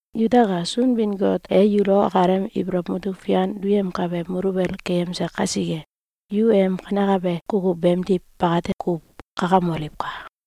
Yutaka! Sunbin-Got e yulo akalem ibolow mutuk fian duyemkabe muluwel keyemse kasike, yu em kanekabe kukuw beemdiw bakate kuw kakamoliwka!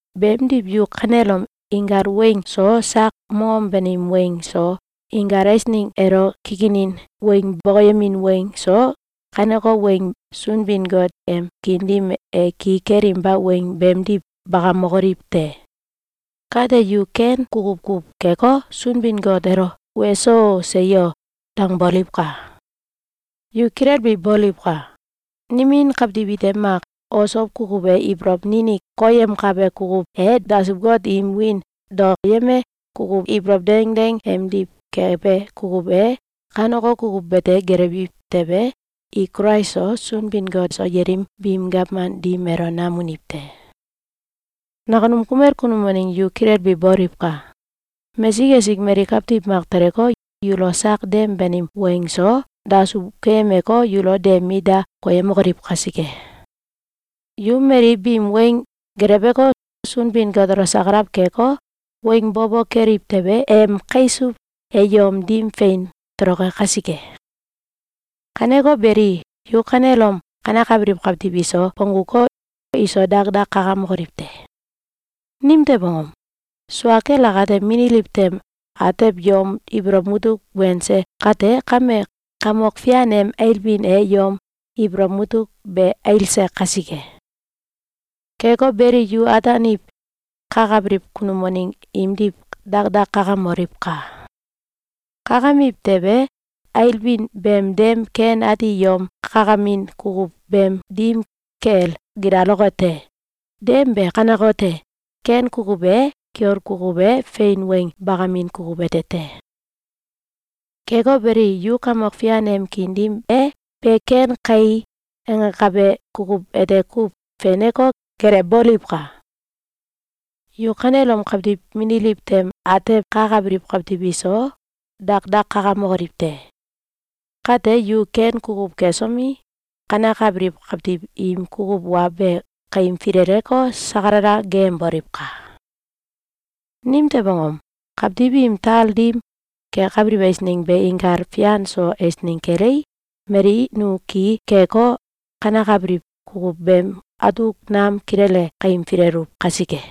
Beemdiw yu kanelom inkal weng so, sak mongom banim weng so, inkal eisneng elo kikinin weng bokoyemin weng so, kaneko weng Sunbin-Got em kiin dim e ki kelinba weng beemdiw bakamokoliw te! Kate yu ken kukuw kuw keko, Sunbin-Got elo “Weso! Seyo!”, dangboliwka! Yu kilelbi boliwka! Nimin kawtiw ite mak osow kukuw e, ibolow ninik koyemkabe kukuw e, dasuw-got im wiin daoyembe kukuw ibolow dengdeng emdiw kebe kukuw e, kaneko kukuw bete gelewbiw tewe, i Kulais so, Sunbin-Got so, yelim biim gawman dim elo nam uniw te. Nakunum kumel kunum waneng yu kilelbi boliwka! Mesik esik mali kawtiw mak teleko, yulo sak dem banim weng so dasuw keyemeko, yulo de mit da koyemokoliw kasike. Yu mali biim weng geleweko, Sunbin-Got elo sakalaw keko, weng bo bo keliw tewe, em kaisuw e yom dim fein toloke kasike. Kaneko beli, yu kanelom kanekabiliw kawtiw iso bongguko, iso dakdak kakamokoliw te! Nimtew angom? Sua kel akate, mililiw tem atew yom ibolow mutuk wense kate kame, Kamok Fian em ailbin e yom ibolow mutuk be ailse kasike. Keko beli, yu ataaniw kakabiliw kunum waneng imdiw dakdak kakamoliwka! Kakamiw tewe, ailbin beem dem ken ati yom kakamin kukuw beem dim kel gilaloke te. Dem be kanekote: Ken kukuw e, kiol kukuw e, fein weng bakamin kukuw ete te. Keko beli, yu Kamok Fian em kiin dim e “Be ken kai!”, angakabe kukuw ete kuw feneko, gelewboliwka! Yu kanelom kawtiw mililiw tem atew kakabiliw kawtiw iso dakdak kakamokoliw te! Kate, yu ken kukuw kesomi, kanekabiliw kawtiw im kukuw wa be kaim fileleko, sakalala geeyemboliwka! Nimtew angom? Kawtiw im tal dim kekabiliw eisneng be inkal fian so eisneng kelei, mali nu ki keko, kanekabiliw kukuw beem atuk nam kilele kaim fileluw kasike.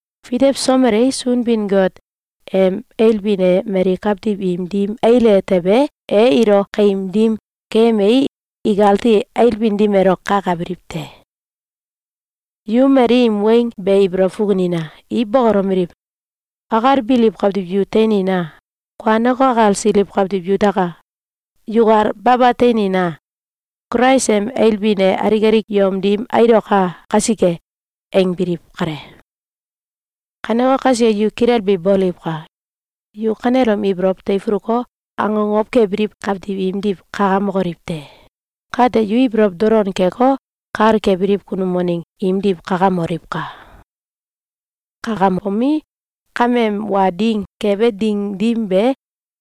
Fitewsomelei, Sunbin-Got em ailbin e mali kawtiw im dim aile tewe, e ilo kaim dim keyemei, ikati ailbin dim elo kakabiliw te. Yu mali im weng be ibolow fukunina! I bokolomeliw: “Akalbiliw kawtiw yu teinina! Kuaneko, akalsiliw kawtiw yutaka! Yukal baba teinina! Kulais em ailbin e alik alik yom dim ailoka kasike!”, angbiliw kale. Kaneko kasike, yu kilelbi boliwka! Yu kanelom ibolow teifuluko, akokow kebiliw kawtiw imdiw kakamokoliw te! Kate, yu ibolow dolon keko, kal kebiliw kunum waneng imdiw kakamoliwka! Kakambomi, kameem wa ding kebe ding dim be,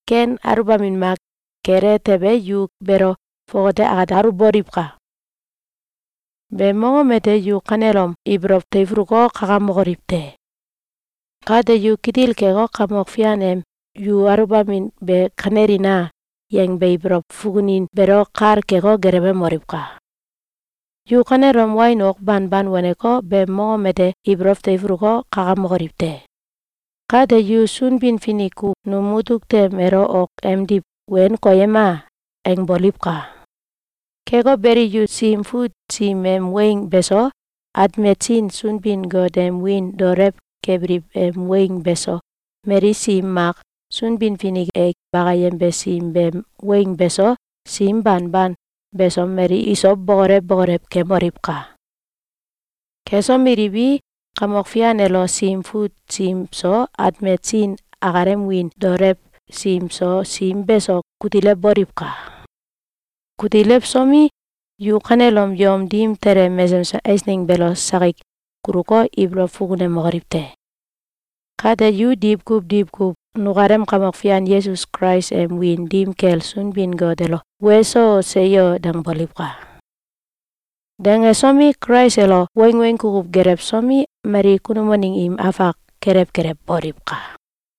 ken aluwbamin mak kele tewe, yu beelo fongate akate aluwboliwka! Beem mongom ete yu kanelom ibolow teifuluko, kakamokoliw te! Kate yu kitil keko, Kamok Fian em “Yu aluwbamin be kanelina!”, yangbe ibolow fukunin beelo kal keko, gelewemoliwka! Yu kanelom wain ok banban waneko, beem mongom ete ibolow teifuluko, kakamokoliw te! Kate, yu “Sunbin-Finik ku num mutuk tem elo ok emdiw wen koyema!”, angboliwka! Keko beli, yu Sim Fut sim em weng beso, atmet sin Sunbin-Got em wiin daolew kebiliw em weng beso, mali sim mak Sunbin-Finik e bakayembe sim beem weng beso, sim banban beso mali iso bokolew bokolew keemoliwka! Kesomeliwi, Kamok Fian elo Sim Fut sim so, atmet sin akalem wiin daolew sim so, sim beso kutilewboliwka! Kutilewsomi, yu kanelom yom dim tele mesesem eisneng beelo sakik kuluko, ibolow fukunemokoliw te! Kate, yu diwkuw diwkuw nukalem Kamok Fian Yesus Kulais em wiin dim kel Sunbin-Got elo “Weso! Seyo!”, dangboliwka! Dangsomi, Kulais elo wangweng kukuw gelewsomi, mali kunum waneng im afak kelew kelew boliwka!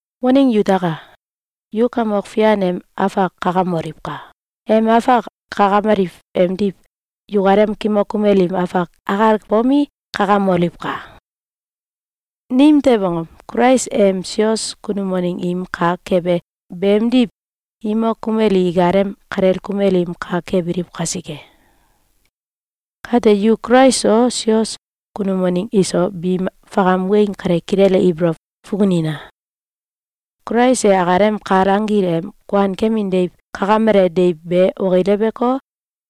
Waneng yutaka! Yu Kamok Fian em afak kakamoliwka! Em afak kakameliw emdiw yukalem kimok kumel im afak akal bomi, kakamoliwka! Nimtew angom? Kulais em sios kunum waneng im kak kebe beemdiw imok kumel i ikalem kalel kumel im kak kebiliw kasike. Kate yu Kulais so, sios kunum waneng iso, biim fakam weng kale kilele ibolow fukunina! Kulais e akalem kal anggil em kuankemin deiw kakamele deiw be okileweko,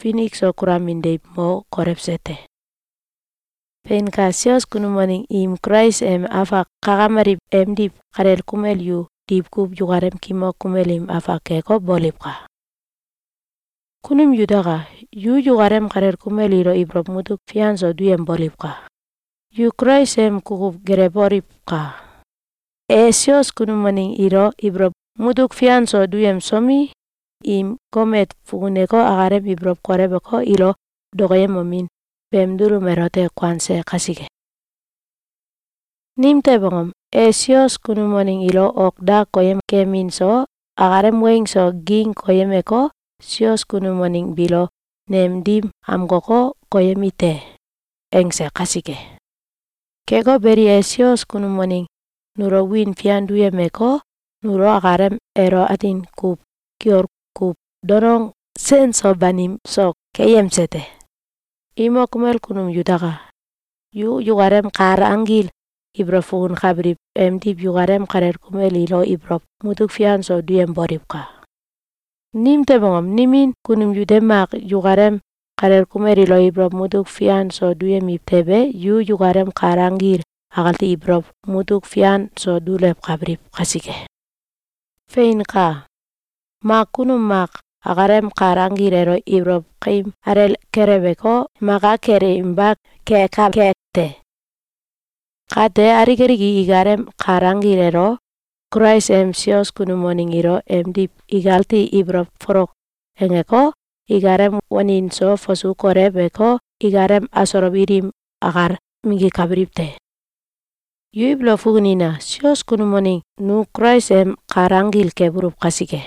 finik so kulamin deiw mo kolewse te. Feinka! Sios kunum waneng im Kulais em afak kakameliw emdiw kalel kumel yu diwkuw yukalem kimok kumel im afak keko, boliwka! Kunum yutaka! Yu yukalem kalel kumel ilo ibolow mutuk fian so duyemboliwka! Yu Kulais em kukuw gelewoliwka! E sios kunum waneng ilo ibolow mutuk fian so duyemsomi, im gomet fukuneko, akalem ibolow kolewko, ilo dokoyemomin beem dulum elote kuanse kasike. Nimtew angom? E sios kunum waneng ilo ok da koyem kemin so, akalem weng so, ging koyemeko, “Sios kunum waneng biilo nem dim amkoko, koyemi te!”, angse kasike. Keko beli, e sios kunum waneng nulo wiin fian duyemeko, nulo akalem elo atin kuw kiol kuw donong sen so banim so keyemse te. Imok kumel kunum yutaka! Yu yukalem kal anggil ibolow fukunkabiliw emdiw yukalem kalel kumel ilo ibolow mutuk fian so duyemboliwka! Nimtew angom? Nimin kunum yute mak yukalem kalel kumel ilo ibolow mutuk fian so duyemiw tewe, yu yukalem kal anggil akati ibolow mutuk fian so dulewkabiliw kasike. Feinka! Mak kunum mak akalem kal anggil elo ibolow kaim alel kelewko, maka kelewinba kekake te. Kate, alik alik i ikalem kal anggil elo Kulais em sios kunum waneng ilo emdiw ikati ibolow folok angeko, ikalem wanin so fasu koleweko, ikalem asolow ilim akal minggikabiliw te. Yu ibolow fukunina! Sios kunum waneng nu Kulais em kal anggil kebuluw kasike.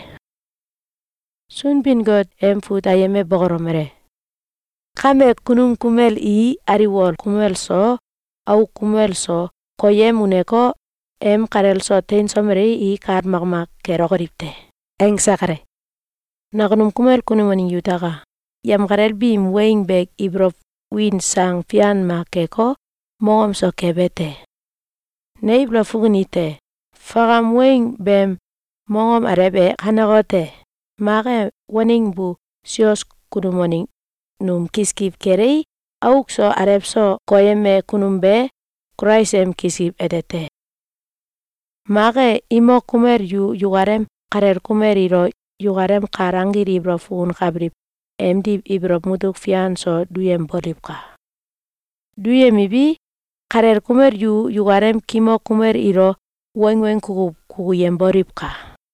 Sunbin-Got em fut ayem e bokolomele: “Kame, kunum kumel i aliwol kumel so auk kumel so koyem uneko, em kalel so teinsomelei, i kal makmak kelokoliw te.”, angse kale. Nakunum kumel kunum waneng yutaka! Yemkalel biim weng be ibolow win sang fian mak keko, mongom so kebe te. Ne ibolow fukunite: Fakam weng beem mongom alew e kanekote: Mak e, waneng bu sios kunum waneng num kiskiw kelei, auk so alew so koyeme kunum be Kulais em kiskiw ete te. Mak e, imok kumel yu yukalem kalel kumel ilo yukalem kal anggil ibolow fukunkabiliw emdiw ibolow mutuk fian so duyemboliwka! Duyemiwi, kalel kumel yu yukalem kimok kumel ilo wangweng kukuw kukuyemboliwka!